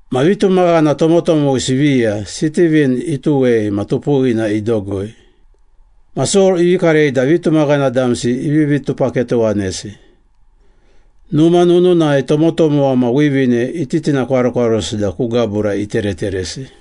Ma vitumaghana tomotomowisi viya Sitivin ituwei ma tupuwina idogoi. Ma Sol ivi karei da vitumaghana damsi ivivi tupaketowanesi. Numa nununai tomotomowa ma wivine ititinakwarokwarosi da ku gabura itereteresi.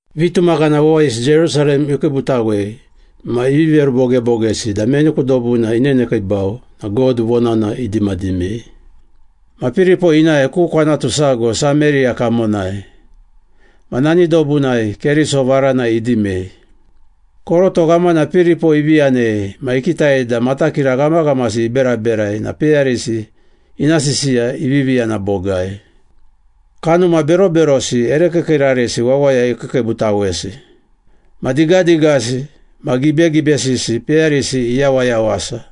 Vitumaghana wawayisi Jerusalem ikiibutawei ma ivi verubogebogesi da meni ku dobuna inenekiibau na God vonana idimadimei. Ma Piripo inae ku kwanatu sago Sameriya kamonai, ma nani dobunai Keriso varana idimei. Koroto ghamana Piripo ivi yanei ma ikitai da matakira ghamaghamasi iberaberai na peyarisi ina sisiya ivivi yana bogai. Kanuma beroberosi ere kiikiirarisi wawaya ikiikiibutawesi. Ma digadigasi ma gibegibesisi peyarisi iyawayawasa.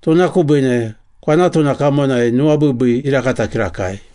Tuna kubiine kwanatuna kamonai nuwabiibii irakata kirakai.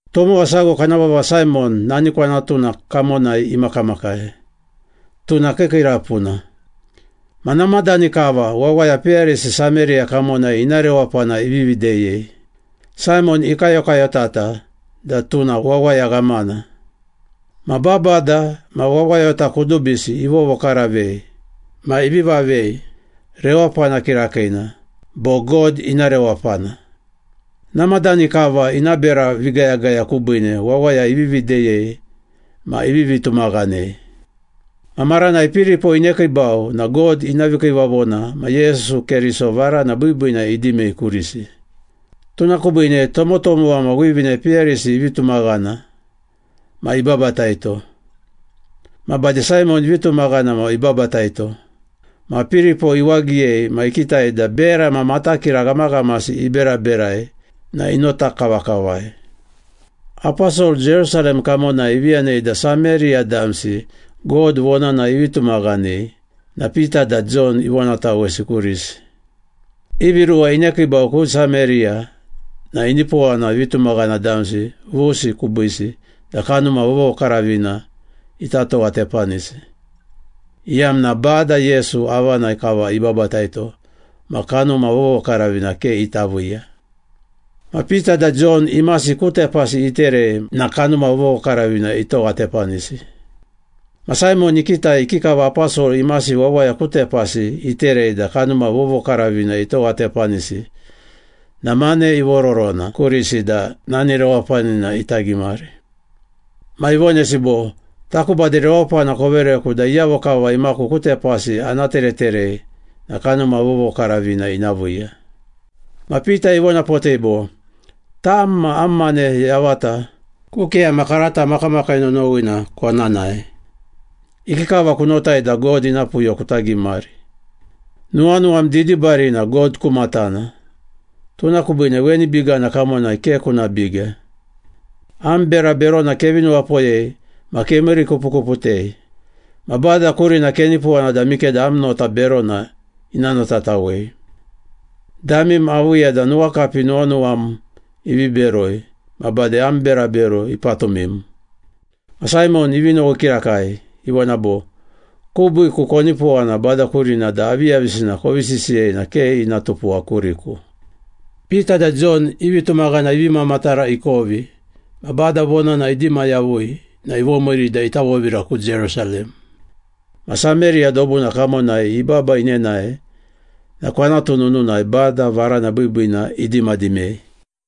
Tomowa sago kana vava Saimon nani kwanatuna kamonai imakamakai, tuna kiikiirapuna. Ma namadani kava wawaya peyarisi Sameriya kamonai ina rewapana ivivi deyei. Saimon ikayokayotata da tuna wawaya ghamana. Ma babada ma wawayota kudubisi ivovokaravei ma ivi vavei ‘Rewapana Kirakiina’ bo ‘God Ina Rewapana.’ Namadani kava ina bera vigayagaya kubiine wawaya ivivi deyei ma ivivi tumaghanei. Ma maranai Piripo inekiibau na God ina vikiivavona ma Yesu Keriso varana biibiina idimei kurisi. Tuna kubiine tomotomowa ma wivine peyarisi ivi tumaghana ma ibabataito. Ma bade Saimon ivi tumaghana ma ibabataito. Ma Piripo iwagiyei ma ikitai da bera ma matakira ghamaghamasi iberaberai na inota kavakavai. Aposol Jerusalem kamonai ivi yanei da Sameriya damsi God vonana ivi tumaghanei na Pita da Jon ivonatawesi kurisi. Ivi ruwa inekiibau ku Sameriya na inipowana vitumaghana damsi vusi kubiisi da Kanuma Vovokaravina ita towatepanisi, iyamna Bada Yesu avanai kava ibabataito ma Kanuma Vovokaravina ke ita viiya. Ma Pita da Jon imasi ku tepasi iterei na Kanuma Vovokaravina itowatepanisi. Ma Saimon ikitai ikikava aposol imasi wawaya ku tepasi iterei da Kanuma Vovokaravina itowatepanisi na mane ivororona kurisi da nani rewapanina ita gimari. Ma ivonesi bo, “Taku bade rewapana kovereku da iyavo kava imaku ku tepasi ana tereterei na Kanuma Vovokaravina ina viiya.” Ma Pita ivonapotei bo, “Tam ma am mane yavata ku keyama karata makamakii nonowina kona nae! Ikikava kunotai da God ina puyo kuta gimari? Nuwanuwam didibarina God ku matana, tuna kubiine weni bigana kamonai ke kuna biga! Am bera berona kevi nuwapoyei ma kemiirikupukuputei. Ma Bada kurina kenipowana da mikeda am nota berona ina notatawei. Damim aviiya da nuwakapi nuwanuwam ivi beroi ma bade am berabero ipatumim.” Ma Saimon ivi nowi kirakai, ivona bo, “Kubiiku konipowana Bada kurina da aviyavisina kovi sisiyei na ke ina tupuwa kuriku.” Pita da Jon i vitumaghana ivi mamatara ikovi ma Bada Vonana idima yavui na ivomiiri da ita vovira ku Jerusalem. Ma Sameriya dobuna kamonai ibaba inenae na kwanatu nununai Bada Varana Biibiina idimadimei.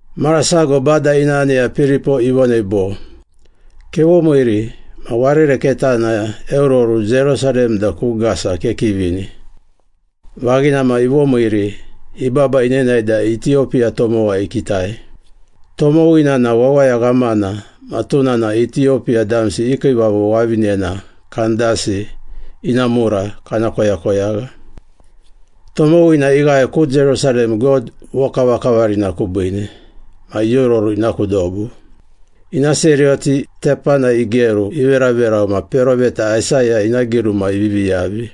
Mara sago Bada ina aneya Piripo ivonei bo, “Kevomiiri ma warere ketana eororu Jerusalem da ku Gasa kekivini.” Vaghina ma ivomiiri, ibaba inenae da Itiyopiya tomowa ikitai. Tomowina na wawaya ghamana ma tuna na Itiyopiya damsi i kiivavo wavinena Kandasi ina mura kana koyakoyagha. Tomowina ighae ku Jerusalem God vokavakavarina kubiine ma iororu ina ku dobu. Ina seriyoti tepanai igeru iveraverau ma peroveta Aisaya ina giruma ivivi yavi.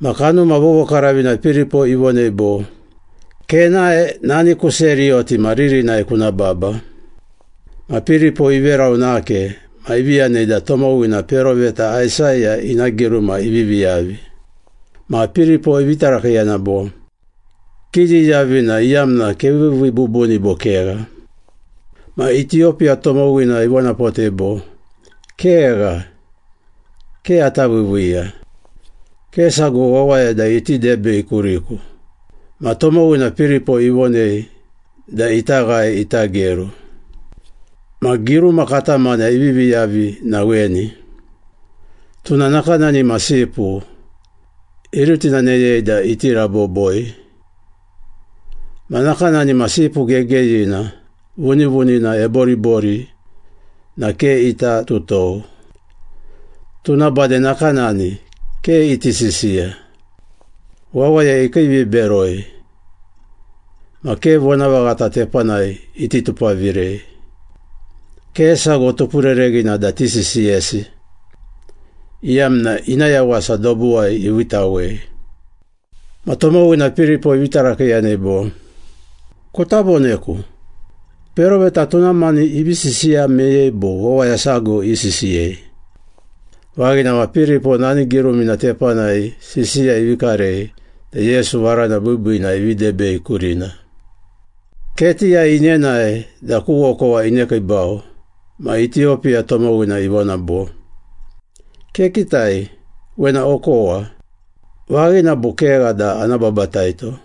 Ma Kanuma Vovokaravina Piripo ivonei bo, “Kenae nani ku seriyoti ma ririnai kuna baba.” Ma Piripo iverau nake ma ivi yanei da tomowina peroveta Aisaya ina giruma ivivi yavi. Ma Piripo ivi tarakiiyana bo, “Kiyiyavi na iyamna keviivii bubuni, bo kegha?” Ma Itiyopiya tomowina ivonapotei bo, “Kegha, ke ata viiviiya. Ke sago wawaya da iti debei kuriku.” Ma tomowina Piripo ivonei da ita ghae ita geru. Ma giruma katamana ivivi yavi na weni, “Tuna nakanani ma sipu, irutinaneyei da iti raboboi, Ma nakanani ma sipu gegeyina, vunivunina eboribori na ke ita tutou, Tuna bade nakanani, ke iti sisiya. Wawaya ikiiviberoi, ma ke vonavaghata tepanai iti tupavirei, Ke sago tupurereghina da tisisiyesi, Iyamna, ina yawasa dobuwai iviitawei.” Ma tomowina Piripo ivi tarakiiyanei bo, “Kuta voneku, peroveta tuna mani ivi sisiya meyei bo wawaya sago isisiyei?” Vaghina ma Piripo nani girumina tepanai sisiya ivi karei da Yesu Varana Biibiina ivi debei kurina. Ketiyai inenae da ku okowa inekiibau ma Itiyopiya tomowina ivona bo, “Kekitai, wena okowa. Vaghina bo kegha da ana babataito?”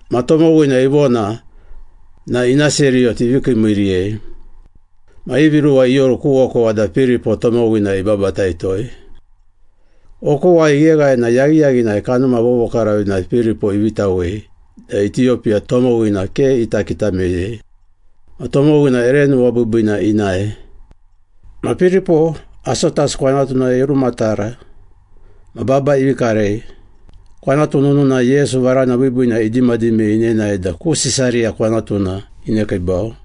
Ma tomowina ivona na ina seriyoti ivi kiimiiiriyei. Ma ivi ruwa ioru ku okowa da Piripo tomowina ibabataitoi. Okowai igheghae na yaghiyaghinai Kanuma Vovokaravina Piripo iviitawei da Itiyopiya tomowina ke ita kita meyei. Ma tomowina ere nuwabiibiina inae. Ma Piripo, Asotas kwanatunai irumatara ma baba ivi karei. Kwanatu nununai Yesu varana biibiina idimadimei inenae da ku Sisariya kwanatuna inekiibau.